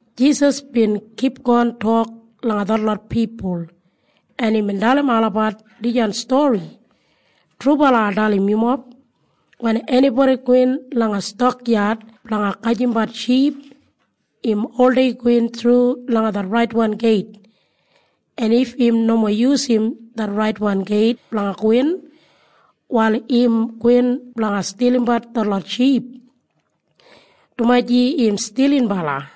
Jisas bin kipgon tok langa detlot pipul, en imbin dalim olabat dijan stori, “Trubala ai dalim yumob. Wen enibodi gowin langa stakyad blanga gajimbat ship, im oldei gowin thru langa det raitwan geit. En if im nomo yusum det raitwan geit blanga gowin, wal im gowin blanga stilimbat detlot ship, dumaji im stilinbala.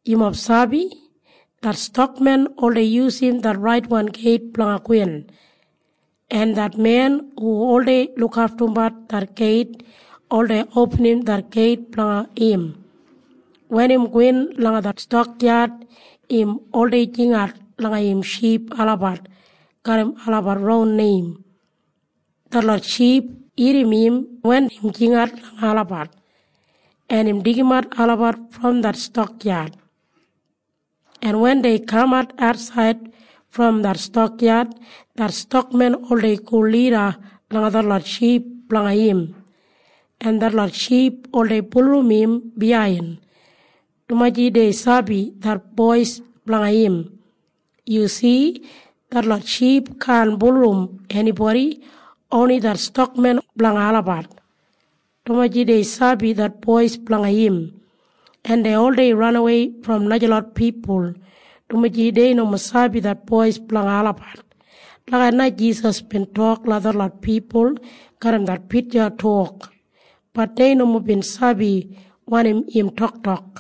“Yumob sabi? Det stakmen oldei yusum det raitwan geit blanga gowin, en det men hu oldei lukaftumbat det geit oldei opinim det geit blanga im. Wen im gowin langa det stakyad, im oldei jingat langa im ship olabat garram olabat ron neim. Detlot ship irrim im wen im jingat langa olabat, en im deigimat olabat brom det stakyad. En wen dei kamat atsaid brom det stakyad, det stakmen oldei go lida langa detlot ship blanga im, en detlot ship oldei bulurrum im biyain, dumaji dei sabi det bois blanga im. “Yu si? Detlot ship kaan bulurrum enibodi. Oni det stakmen blanga olabat, dumaji dei sabi det bois blanga im. En dei oldei ranawei brom najalot pipul, dumaji dei nomo sabi det bois blanga olabat.” Lagijat na Jisas bin tok langa detlot pipul garram det pitja tok. Bat dei nomo bin sabi wanim im toktok.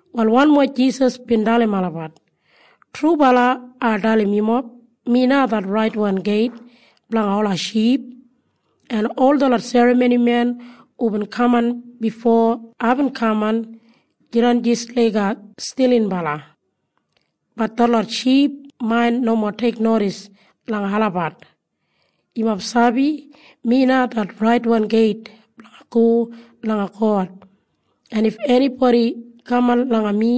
Wal wanmo Jisas bin dalim olabat, “Trubala ai dalim yumob. Mi na det raitwan geit blanga ola ship. En ol detlot serramonimen hubin kaman bifo aibin kaman jidan jis laiga stilinbala. Bat detlot ship main nomo teiknodis langa olabat. “Yumob sabi? Mi na det raitwan geit blanga go langa God. En if enibodi kaman langa mi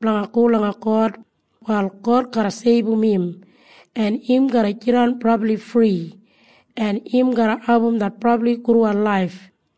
blanga go langa God, wal God garra seibum im, en im garra jidan brabli fri, en im garra abum det brabli gudwan laif.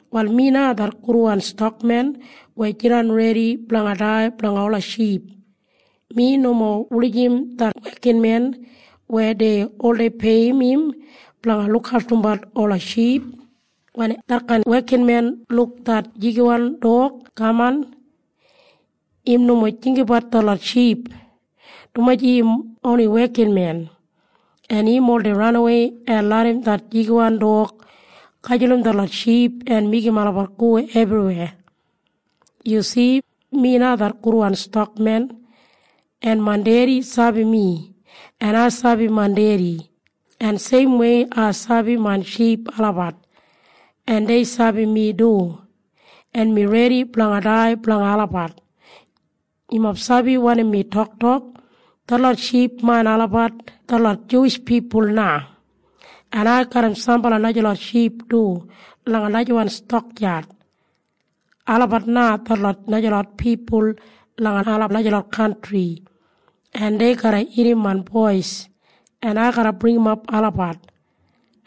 “Wal mi na det gudwan stakmen weya jidan redi blanga dai blanga ola ship. Mi nomo wulijim det wekinmen weya dei oldei peiyim im blanga lukaftumbat ola ship. Wen detkain wekinmen luk det jigiwan dog kaman, im nomo jinggabat detlot ship, dumaji im oni wekinmen, en im oldei ranawei en larram det jigiwan dog gajulum detlot ship en meigim olabat go ebriweya. “Yu si? Mi na det gudwan stakmen. En main Dedi sabi mi, en ai sabi main Dedi, en seimwei ai sabi main ship olabat, en dei sabi mi du. En mi redi blanga dai blanga olabat. “Yumob sabi wanim mi toktok? Detlot ship main olabat detlot Juwish pipul na. En ai garram sambala najalot ship du langa najawan stakyad. Olabat na detlot najalot pipul langa ola najalot kantri, en dei garra irrim main bois, en ai garra bringimap olabat,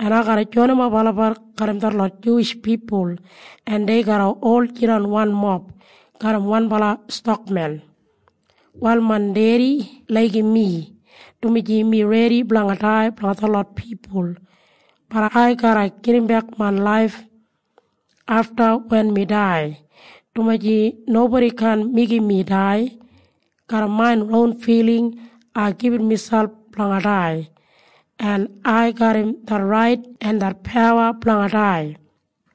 en ai garra joinimap olabat garram detlot Juwish pipul, en dei garra ol jidan wanmob garram wanbala stakmen. “Wal main Dedi laigim mi, dumaji mi redi blanga dai blanga detlot pipul. Bat ai garra gedimbek main laif afta wen mi dai, dumaji nobodi kaan meigim mi dai. Garram main ron filing ai gibit miselp blanga dai. En ai garram det rait en det pawa blanga dai,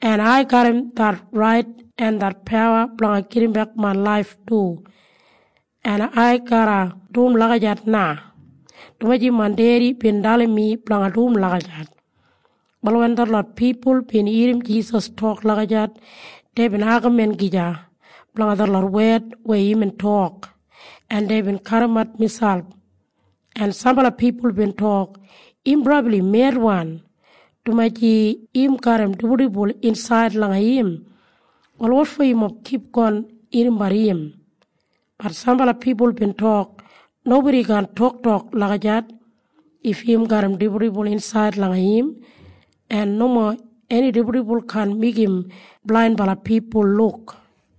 en ai garram det rait en det pawa blanga gedimbek main laif du. En ai garra dum lagijat na, dumaji main Dedi bin dalim mi blanga dum lagijat.” Wal wen detlot pipul bin irrim Jisas tok lagijat, deibin agamin gija blanga detlot wed weya imbin tok, en deibin kadimat miselp, en sambala pipul bin tok, “Im brabli medwan, dumaji im garram dibuldibul insaid langa im. Wal wotfo yumob kipgon irrimbat im?” Bat sambala pipul bin tok, “Nobodi kaan toktok lagijat if im garram dibuldibul insaid langa im. En nomo eni dibuldibul kaan meigim blainbala pipul luk.”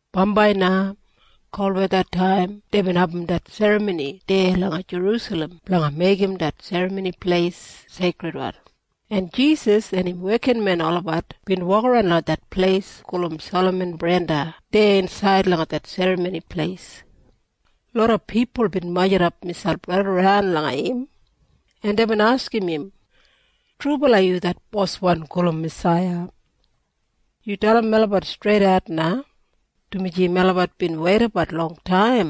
Bambai na kolwethataim deibin abum det serramoni deya langa Jerusalem blanga meigim det Serramoni Pleis seikridwan, en Jisas en im wekinmen olabat bin wokaran langa det pleis gulum Salaman Brenda deya insaid langa det Serramoni Pleis. Loda pipul bin majurrumap miselp raidaran langa im, en deibin askim im, “Trubala yu det Boswan gulum Masaiya? Yu dalim melabat streidat na, dumaji melabat bin weidabat longtaim.”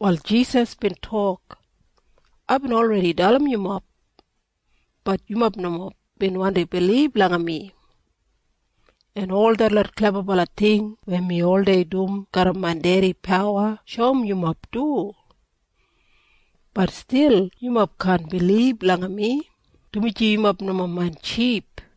Wal Jisas bin tok, “Aibin olredi dalim yumob. Bat yumob nomo bin wandi bilib langa mi. En ol detlot klebabala ting weya mi oldei dum garram main Dedi pawa shoum yumob du. Bat stil yumob kaan bilib langa mi, dumaji yumob nomo main ship.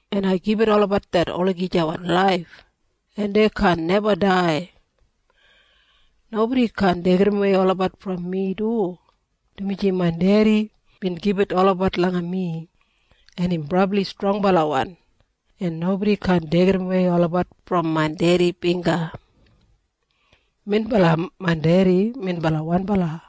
en ai gibit olabat det olagijawan laif, en dei kaan neba dai. Nobodi kaan deigidawei olabat brom mi du, dumaji main Dedi bin gibit olabat langa mi, en im brabli strongbalawan, en nobodi kaan deigidawei olabat brom main Dedi bingga. Minbala main Dedi minbala wanbala.”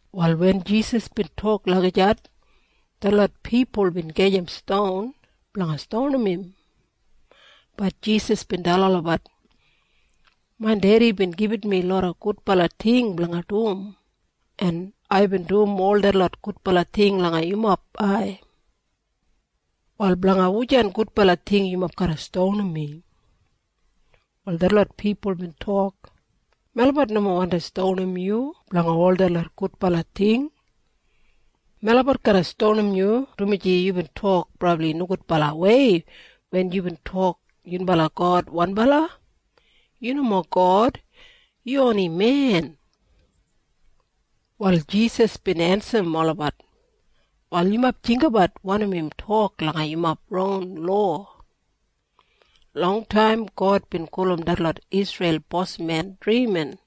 Wal wen Jisas bin tok lagijat, detlot pipul bin gajim ston blanga stonim im. Bat Jisas bin dalim olabat, “Main Dedi bin gibit mi loda gudbala ting blanga dum, en aibin dum ol detlot gudbala ting langa yumob ai. Wal blanga wujan gudbala ting yumob garra stonim mi?” Wal detlot pipul bin tok, “Melabat nomo wandi stonim yu blanga ol detlot gudbala ting. Melabat garra stonim yu dumaji yubin tok brabli nogudbalawei wen yubin tok yunbala God wanbala. Yu nomo God. Yu oni men.” Wal Jisas bin ensim olabat, “Wal yumob jinggabat wanim im tok langa yumob ron lowa. Longtaim God bin gulum detlot Isreil bosmen ‘drimin’.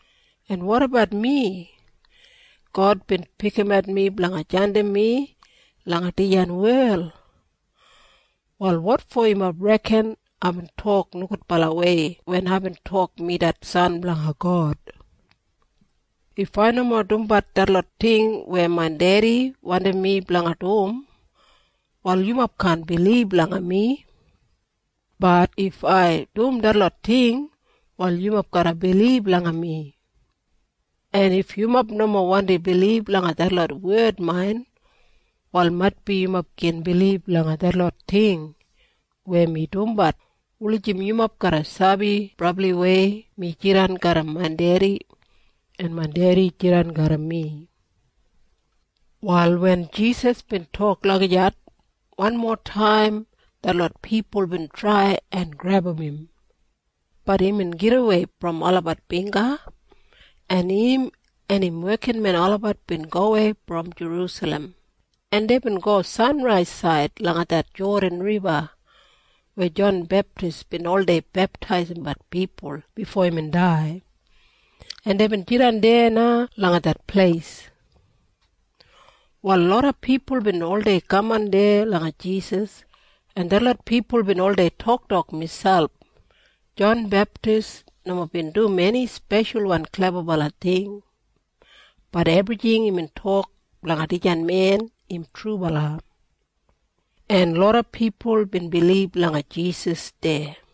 En wotabat mi? God bin pikimat mi blanga jandim mi langa dijan wel. Wal wotfo yumob reken aibin tok nogudbalawei wen aibin tok mi det San blanga God? If ai nomo dumbat detlot ting weya main Dedi wandim mi blanga dum, wal yumob kaan bilib langa mi. Bat if ai dum detlot ting, wal yumob garra bilib langa mi. En if yumob nomo wandi bilib langa detlot wed main, wal maitbi yumob gin bilib langa detlot ting weya mi dumbat wulijim yumob garra sabi brabliwei mi jidan garram main Dedi, en main Dedi jidan garram mi.” Wal wen Jisas bin tok lagijat, wanmotaim detlot pipul bin trai en grebum im. Bat imbin gidawei brom olabat bingga, en im en im wekinmen olabat bin gowei brom Jerusalem, en deibin go sanraisaid langa det Jodan Riba weya Jon Beptis bin oldei beptaisimbat pipul bifo imbin dai, en deibin jidan deya na langa det pleis. Wal loda pipul bin oldei kaman deya langa Jisas, en detlot pipul bin oldei toktok miselp, “Jon Beptis nomo bin dum eni speshalwan klebabala ting. Bat ebrijing imbin tok blanga dijan men im trubala.” En loda pipul bin bilib langa Jisas deya.